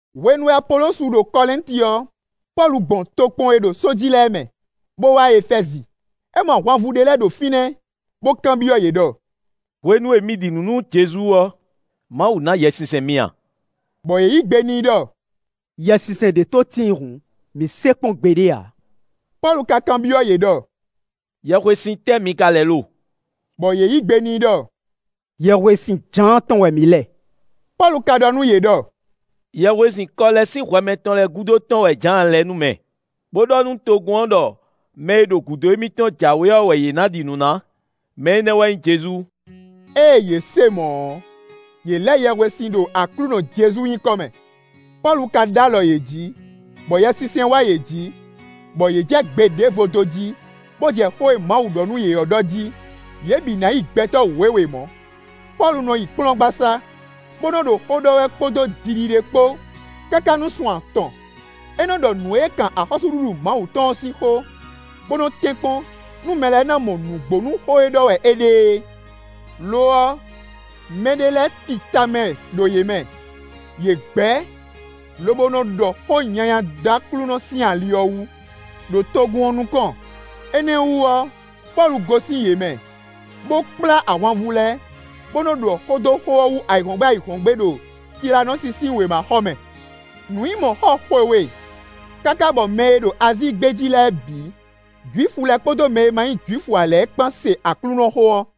Hwenu e Apolosu ɖo Kɔlɛ́nti ɔ́, Pɔ́lu gbɔn tokpɔn e ɖo só jí lɛ́ɛ mɛ, bó wá Efɛ́zi. É mɔ ahwanvú ɖé lɛ́ɛ ɖo fínɛ́, bó kanbyɔ́ yě ɖɔ: “Hwenu e mi ɖi nǔ nú Jezu ɔ́, Mawu ná Yɛsinsɛn mi a?” Bɔ yě yǐ gbe n'i ɖɔ: “Yɛsinsɛn ɖé tó tíin hǔn, mǐ se kpɔ́n gbeɖé ǎ.” Pɔ́lu ka kanbyɔ́ yě ɖɔ: “Yɛhwesin tɛ́ mi ka lɛ lo?” Bɔ yě yí gbe n'i ɖɔ: “Yɛhwesin Jǎan tɔn wɛ mǐ lɛ.” Pɔ́lu ka ɖɔ nú yě ɖɔ: “Yɛhwesin kɔ lɛ́ sín hwɛ mɛtɔn lɛ́ɛ gúdo tɔn wɛ Jǎan lɛ nú mɛ, bó ɖɔ nú togun ɔ́ ɖɔ mɛ e ɖo gúdo émítɔn jǎwe ɔ́ wɛ yě ná ɖi nǔ ná; mɛ énɛ́ wɛ nyí Jezu.” Ée yě se mɔ̌ ɔ́, yě lɛ yɛhwesin ɖo Aklúnɔ Jezu nyǐkɔ mɛ. Pɔ́lu ka ɖó alɔ yě jí, bɔ Yɛsinsɛn wá yě jǐ, bɔ yě jɛ gbe ɖěvo dó jí, bó jɛ xó e Mawu ɖɔ nú yě ɔ́ ɖɔ jí. Yě bǐ ná yi gbɛtɔ́ wěwe mɔ̌. Pɔ́lu nɔ yi kplɔ́ngbasá, bó nɔ ɖo xó ɖɔ wɛ kpódó jiɖiɖe kpó káká nú sun atɔn; é nɔ ɖɔ nǔ e kan axɔ́súɖuɖu Mawu tɔn ɔ́ sín xó, bó nɔ́ tɛ́nkpɔ́n nú mɛ lɛ́ɛ ná mɔ nǔgbó nú xó e ɖɔ wɛ é ɖe é. Lo ɔ́, mɛɖé lɛ́ɛ ti tamɛ ɖo yě mɛ; yě gbɛ̌, lobo nɔ ɖɔ xó nyanya dó Aklúnɔ sín ali ɔ́ wú, ɖo togun ɔ́ nukɔn; énɛ́ ɔ́ wú ɔ́, Pɔ́lu gosín yě mɛ, bó kplá ahwanvú lɛ́ɛ, bó nɔ́ ɖɔ xó dó xó ɔ́ wú ayǐhɔ́ngbe ayǐhɔ́ngbe ɖo Tilánɔsi sín wěmaxɔmɛ. Nǔ nyí mɔ̌ xɔ xwe we, káká bɔ mɛ e ɖo Azíi gbé jí lɛ́ɛ bǐ: Jwifu lɛ́ɛ kpódó mɛ e ma nyí Jwifu ǎ lɛ́ɛ kpán se Aklúnɔxó ɔ́.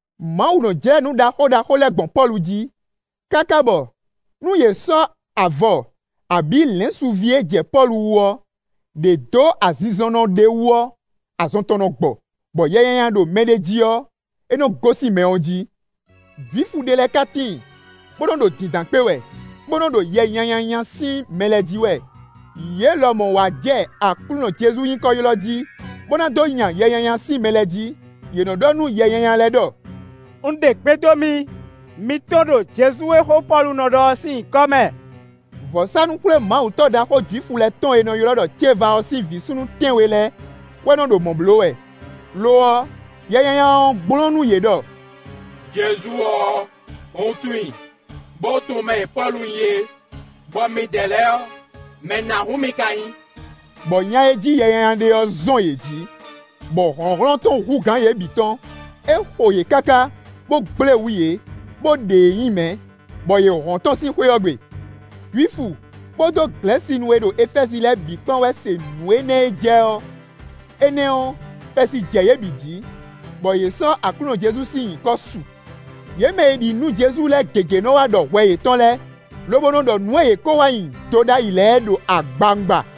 Mawu nɔ́ jlɛ́ nǔ ɖaxó ɖaxó lɛ́ɛ gbɔn Pɔ́lu jí, káká bɔ nú yě sɔ́ avɔ abǐ lɛ̌nsuví e jɛ Pɔ́lu wú ɔ́, ɖě dó azinzɔnnɔ ɖé wú ɔ́, azɔn tɔn nɔ gbɔ, bɔ yɛ nyanya ɖo mɛɖé jí ɔ́, é nɔ́ gosín mɛ ɔ́ jí. Jwifu ɖé lɛ́ɛ ká tíin, bó nɔ́ ɖo dǐndán kpé wɛ, bó nɔ́ ɖo yɛ nyanya nya sín mɛ lɛ́ɛ jí wɛ; yě lɔmɔ̌ wá jɛ Aklúnɔ Jezu nyǐkɔ ylɔ́ jí, bó ná dó nya yɛ nyanya sín mɛ lɛ́ɛ jí; yě nɔ́ ɖɔ nú yɛ nyanya lɛ́ɛ ɖɔ: “Un ɖe gbe dó mi; mi tɔ́n ɖo Jezu e xó Pɔ́lu nɔ ɖɔ ɔ́ sín nyǐkɔ mɛ.” (Vɔ̌sánú-xwlémawutɔ́ ɖaxó Jwifu lɛ́ɛ tɔn e è nɔ ylɔ́ ɖɔ Ceva ɔ́ sín vǐ súnnu tɛ́nwe lɛ́ɛ wɛ nɔ ɖo mɔ̌ bló wɛ.) Lo ɔ́, yɛ nyanya ɔ́ gblɔ́n nú yě ɖɔ: “Jezu ɔ́, un tunwun i, bó tunwun mɛ e Pɔ́lu nyí é; bɔ midɛɛ lɛ́ɛ ɔ́, mɛ nǎhún mi ka nyí?” Bɔ nya e jí yɛ nyanya ɔ́ ɖe ɔ́ zɔn yě jí, bɔ hlɔ̌nhlɔ́n tɔn hú gǎn yě bǐ tɔn; é xo yě káká, bó gblé wǔ yě, bó ɖe yě nyi mɛ̌, bɔ yě hɔn tɔ́n sín xwé ɔ́ gbe. Jwifu kpódó Glɛ̌sinu e ɖo Efɛ́zi lɛ́ɛ bǐ kpán wɛ se nǔ énɛ́ e jɛ ɔ́; énɛ́ ɔ́, xɛsi jɛ yě bǐ jǐ, bɔ yě sɔ́ Aklúnɔ Jezu sín nyǐkɔ su. Yě mɛ e ɖi nǔ nú Jezu lɛ́ɛ gěgé nɔ́ wá ɖɔ hwɛ yětɔn lɛ́ɛ, lobo nɔ ɖɔ nǔ e yě ko nɔ wa nyi do ɖ'ayǐ lɛ́ɛ ɖo agbawungba.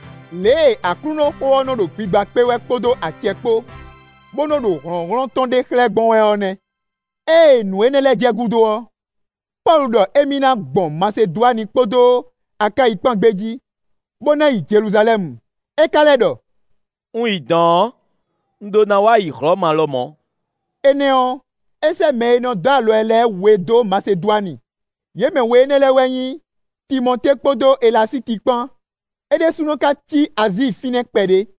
Lě e Aklúnɔxó ɔ́ nɔ́ ɖo gbigba kpé wɛ kpódó acɛ kpó, bó nɔ́ ɖo hlɔ̌nhlɔ́n tɔn ɖe xlɛ́ gbɔn wɛ ɔ́ nɛ́. Ée nǔ énɛ́ lɛ́ɛ jɛ gúdo ɔ́, Pɔ́lu ɖɔ émí ná gbɔn Masedwani kpódó Akáyi kpán gbé jí, bó ná yi Jeluzalɛ́mu. É ka lɛ́ ɖɔ: “Un yi dɔ̌n ɔ́, un ɖó ná wá yi Hlɔ̌ma lɔmɔ̌.” Énɛ́ ɔ́, é sɛ́ mɛ e nɔ dó alɔ ɛ lɛ́ɛ we dó Masedwani; yě mɛ we énɛ́ lɛ́ɛ wɛ nyí: Timɔtée kpódó Elasíti kpán; é ɖésúnɔ ka cí Azíi fínɛ́ kpɛɖé.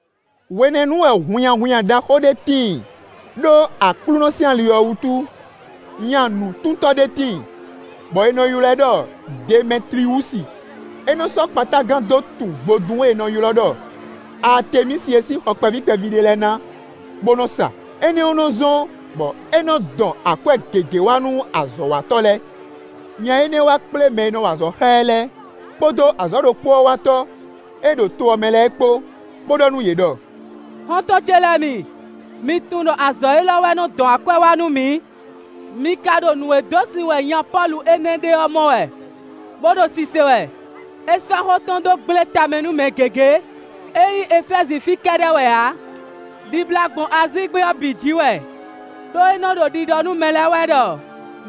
Hwenɛ́nu wɛ hunnyahunnya ɖaxó ɖé tíin ɖó Aklúnɔ sín ali ɔ́ wútu. Nya nǔtuntɔ́ ɖé tíin, bɔ è nɔ ylɔ́ ɛ ɖɔ Demɛtliwúsi; é nɔ sɔ́ kpatágan dó tun vodún e è nɔ ylɔ́ ɖɔ Aatemísi é sín xɔ kpɛví kpɛví ɖé lɛ́ɛ ná bó nɔ́ sa; énɛ́ ɔ́ nɔ́ zɔ́n bɔ é nɔ dɔn akwɛ́ gěgé wá nú azɔ̌watɔ́ lɛ́ɛ. Nya énɛ́ wá kplé mɛ e nɔ wa azɔ̌ xá ɛ lɛ́ɛ, kpódó azɔ̌ ɖokpó ɔ́ watɔ́ e ɖo to ɔ́ mɛ lɛ́ɛ kpó, bó ɖɔ nú yě ɖɔ: “Xɔ́ntɔn ce lɛ́ɛ mi, mi tunwun ɖɔ azɔ̌ élɔ́ wɛ nɔ dɔn akwɛ́ wá nú mǐ. Mi ka ɖo nǔ e dó sin wɛ nya Pɔ́lu énɛ́ ɖe ɔ́ mɔ wɛ, bó ɖo sise wɛ: é sɔ́ xó tɔn dó gblé tamɛ nú mɛ gěgé; ényí Efɛ́zi fí kɛ́ɖɛ́ wɛ ǎ, ɖibla gbɔn Azíi gbé ɔ́ bǐ jǐ wɛ, ɖó é nɔ́ ɖo ɖiɖɔ nú mɛ lɛ́ɛ wɛ ɖɔ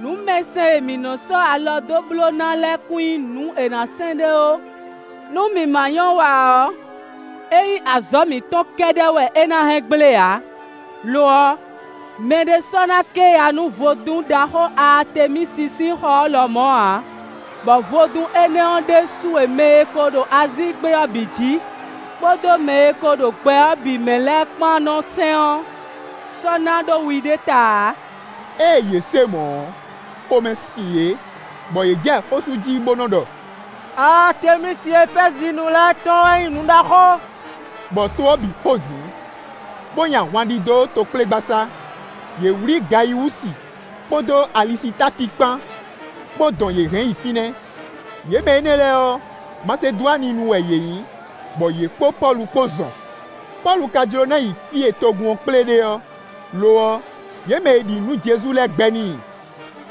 nǔmɛsɛn e mǐ nɔ́ sɔ́ alɔ dó bló ná lɛ́ɛ kún nyí nǔ è nǎ sɛn ɖé ó. Nú mǐ ma nyɔ́ wa ǎ ɔ́, ényí azɔ̌ mǐtɔn kɛ́ɖɛ́ wɛ é ná hɛn gblé ǎ; lo ɔ́, mɛɖé sɔ́ ná ké ya nú vodún ɖaxó Aatemísi sín xɔ ɔ́ lɔmɔ̌ ǎ, bɔ vodún énɛ́ ɔ́ ɖésú e mɛ e ko ɖo Azíi gbé ɔ́ bǐ jí, kpódó mɛ e ko ɖo gbɛ ɔ́ bǐ mɛ lɛ́ɛ kpán nɔ́ sɛn ɔ́ sɔ́ ná ɖó wi ɖé ta ǎ.” Ée yě se mɔ̌ ɔ́, xomɛ sin yě, bɔ yě jɛ xó sú jí bó nɔ́ ɖɔ: “Aatemísi Efɛ́zinu lɛ́ɛ tɔn ɔ́ wɛ nyí nǔ ɖaxó.” Bɔ to ɔ́ bǐ xozǐn, bó nyi ahwan ɖidó tokplégbasá; yě wlí Gayiwúsi kpódó Alisitáki kpán, bó dɔn yě hɛn yi fínɛ́. Yě mɛ énɛ́ lɛ́ɛ ɔ́, Masedwaninu wɛ yě nyí, bɔ yě kpó Pɔ́lu kpó zɔn. Pɔ́lu ka jló ná yi fí e togun ɔ́ kplé ɖe ɔ́; lo ɔ́, yě mɛ e ɖi nǔ nú Jezu lɛ́ɛ gbɛ́ n'i.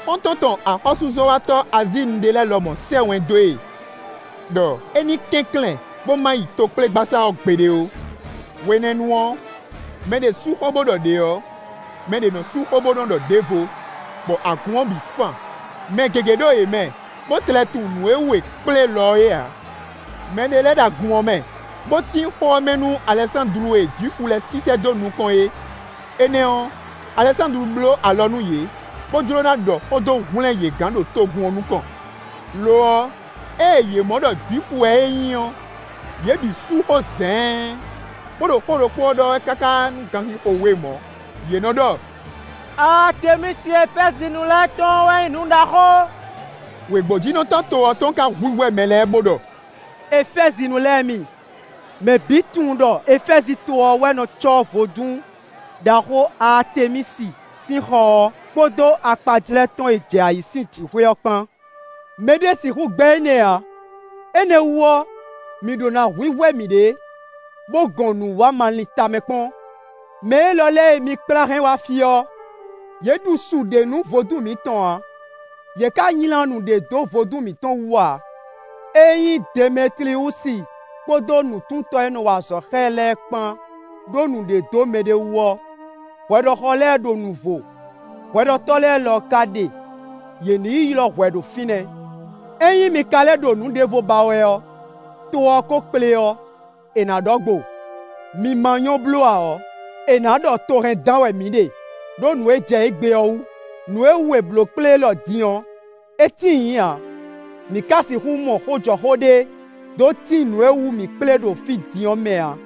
Xɔ́ntɔn tɔn axɔ́súzɔ́watɔ́ Azíinu ɖé lɛ́ɛ lɔmɔ̌ sɛ́ wɛn dó e ɖɔ é ní kɛnklɛ́n bó ma yi tokplégbasá ɔ́ gbeɖé ó. Hwenɛ́nu ɔ́, mɛ ɖě sú xó, bó ɖɔ ɖě ɔ́, mɛ ɖě nɔ́ sú xó bó nɔ́ ɖɔ ɖěvo, bɔ agun ɔ́ bǐ fan. Mɛ gěgé ɖo yě mɛ, bó tlɛ tunwun nǔ e wú è kplé lɔ é ǎ. Mɛ ɖé lɛ́ɛ ɖo agun ɔ́ mɛ, bó tín xó ɔ́ mɛ nú Alɛsándlu e Jwifu lɛ́ɛ sísɛ́ dó nukɔn é; énɛ́ ɔ́, Alɛsándlu bló alɔ nú yě, bó jló ná ɖɔ xó dó hwlɛ́n yě gán ɖo togun ɔ́ nukɔn. Lo ɔ́, ée yě mɔ ɖɔ Jwifu wɛ é nyí ɔ́, yě bǐ sú xó zɛ̌ɛ́n, bó ɖo xó ɖokpó ɔ́ ɖɔ wɛ káká nú ganxixo we mɔ̌; yě nɔ́ ɖɔ: “Aatemísi Efɛ́zinu lɛ́ɛ tɔn ɔ́ wɛ nyí nǔ ɖaxó!” Wěgbójínɔtɔ́ to ɔ́ tɔn ka hwíhwɛ́ mɛ lɛ́ɛ bó ɖɔ: “Efɛ́zinu lɛ́ɛ mi, mɛ bǐ tunwun ɖɔ Efɛ́zi to ɔ́ wɛ nɔ cɔ́ vodún ɖaxó Aatemísi sín xɔ ɔ́, kpódó akpajlɛ́ tɔn e jɛ ayǐ sín jǐxwé ɔ́ kpán. Mɛ ɖé sixú gbɛ́ énɛ́ ǎ; énɛ́ wú ɔ́, mǐ ɖó ná hwíhwɛ́ mǐɖée, bó gɔn nǔ wa ma lin tamɛ kpɔ́n. Mɛ élɔ́ lɛ́ɛ e mi kplá hɛn wá fí ɔ́, yě ɖu su ɖé nú vodún mǐtɔn ǎ, yě ka nylá nu ɖé dó vodún mǐtɔn wú ǎ. Ényí Demɛtliwúsi kpódó nǔtuntɔ́ e nɔ́ wa azɔ̌ xá ɛ lɛ́ɛ kpán ɖó nǔɖé dó mɛɖé wú ɔ́, hwɛɖɔxɔ lɛ́ɛ ɖo nuvo; hwɛɖɔtɔ́ lɛ́ɛ lɔ ka ɖe; yě ní yi ylɔ́ hwɛ ɖo fínɛ́. Ényí mi ka lɛ́ ɖo nǔ ɖěvo ba wɛ ɔ́, to ɔ́ ko kplé ɔ́, è nǎ ɖɔ gbo. Mǐ ma nyɔ́ bló ǎ ɔ́, è nǎ ɖɔ to hɛn dán wɛ mǐ ɖe, ɖó nǔ e jɛ égbé ɔ́ wú; nǔ e wú è blǒ kplé élɔ́ din ɔ́, é tíin nyǐ ǎ; mǐ ka sixú mɔ xó jɔ xó ɖé, dó tín nǔ e wú mǐ kplé ɖo fí din ɔ́ mɛ ǎ.”